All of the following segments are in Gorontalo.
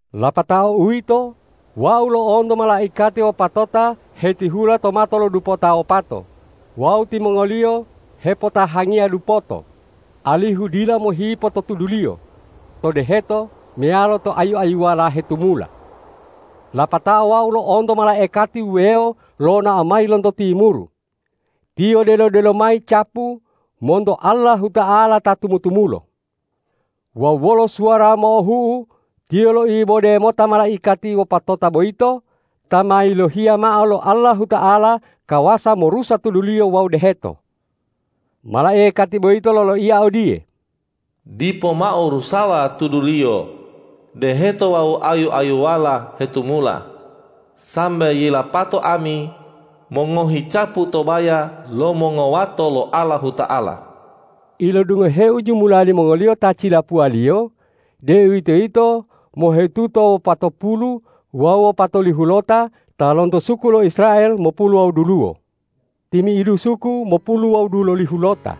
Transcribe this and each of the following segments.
Lapato uwito, wau lo'onto malaikati wopatota hetihula to mato lo dupota wopato wawu timongoliyo hepotahangiya dupoto, alihu dila mohipo to tuduliyo, to deheto meyalo to ayu-ayuwala hetumula. Lapatao wau lo'onto malaikati wuwewo lonao mayi lonto timuru. Tiyo delo-delo mayi capu monto Allahuta'ala ta tumu-tumulo. Wawu wolo suwara mo'ohu'u tiyo loibode mota malaikati wopatota boyito ta ma yilohiya mao lo Allahuta'ala kawasa morusa tuduliyo wawu deheto. Malaikati boyito loloiya odiye,”Dipo mao rusawa tuduliyo, deheto wawu ayu-ayuwala hetumula, sambe yilapato ami mongohi capu to baya lo mongowato lo Allahuta'ala!” Ilodungoheu jumula limongoliyo ta cilapuwaliyo, deuwitoyito mohetuta wopatopulu wawu wopatolihulota ta lonto suku lo Israel mopulu wawu duluwo. Timi'idu suku mopulu wawu dululihulota,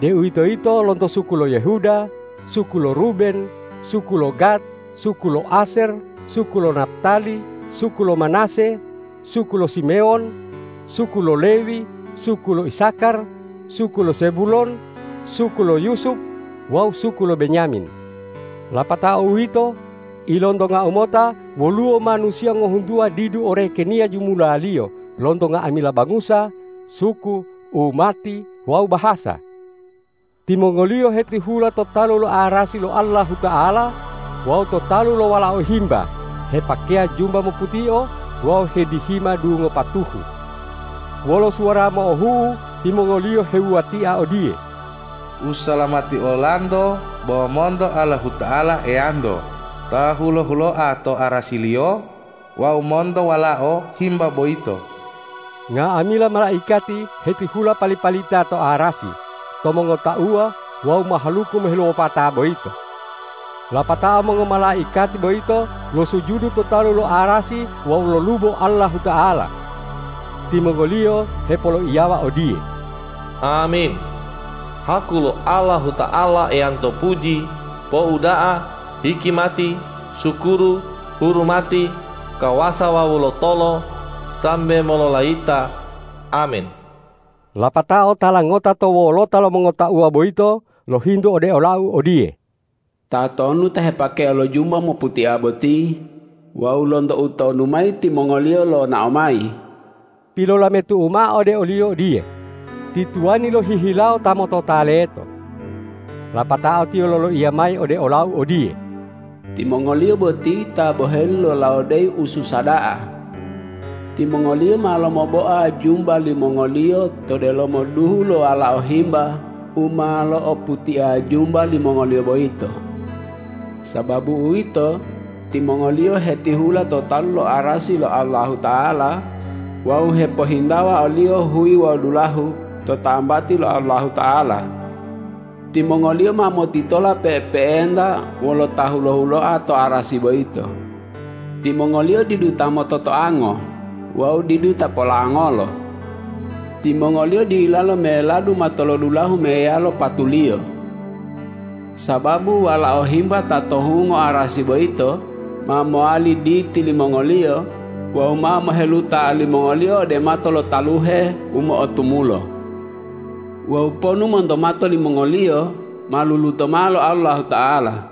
deuwitoyito lonto suku lo Yehuda, suku lo Ruben, suku lo Gad, suku lo Asyer, suku lo Naptali, suku lo Manase, suku lo Simewon, suku lo Lewi, suku lo Isakar, suku lo Zebulon, suku lo Yusup wawu suku lo Benyamin. Lapatao uwito, ilontongau mota woluwo manusiya ngohuntuwa didu orekeniya jumulaliyo lonto nga'amila bangusa, suku, umati wawu bahasa. Timongoliyo hetihula to talu lo arasi lo Allahuta'ala wawu to talu lo Walao Himba hepakeya jumba moputio wawu hedihima dungo patuhu. Wolo suwara mo'ohu'u timongoliyo hewuwatia odiye,”Usalamati olanto bo monto Allahuta'ala Eyanto ta hulo-huloa to arasi-Liyo wawu monto Walao Himba boyito!” Nga'amila malaikati hetihula pali-palita to arasi, to mongotauwa wawu mahaluku moheluwopata boyito. Lapatao mongomalaikati boyito losujudu to talu lo arasi wawu lolubo Allahuta'ala. Timongoliyo hepoloiyawa odiye,”Amin! Haku lo Allahuta'ala Eyanto puji, pouda'a, hikimati, sukuru, hurumati, kawasa wawu lotolo sambe mololayita! Amin.” Lapatao tala ngota to wolota lo mongotauwa boyito lohintu ode olau odiye,”Tatonu ta hepakeya lo jumba moputia boti wawu lonto utonu mayi timongoliyo lonao mayi?” Pilolametu'u mao ode oliyo odiye,”Ti tuwani lohihilawo ta motota leto.” Lapatao tiyo loloiya mayi ode olau odiye,”Timongoliyo boti ta boheli lolawodeyi ususa da'a. Timongoliyo ma lomoboa jumba limongoliyo to delomo duhu lo Walao Himba u ma lo'oputia jumba limongoliyo boyito. Sababu uwito, timongoliyo hetihula to talu lo arasi lo Allahuta'ala wawu hepohintawa o-Liyo huyi wawu dulahu to tambati lo Allahuta'ala. Timongoliyo ma motitola pe'epe'enta wolo Ta hulo-huloa to arasi boyito. Timongoliyo didu ta mototoango wawu didu ta polangolo. Timongoliyo dilalo meladu matolodulahu meyalo patuliyo. Sababu Walao Himba ta to hungo arasi boyito ma mowali Diti limongoliyo wawu ma moheluta olimongoliyo ode mato lo taluhe u mo'otumulo. Wawu ponu monto mato limongoliyo ma luluto mao lo Allahuta'ala.”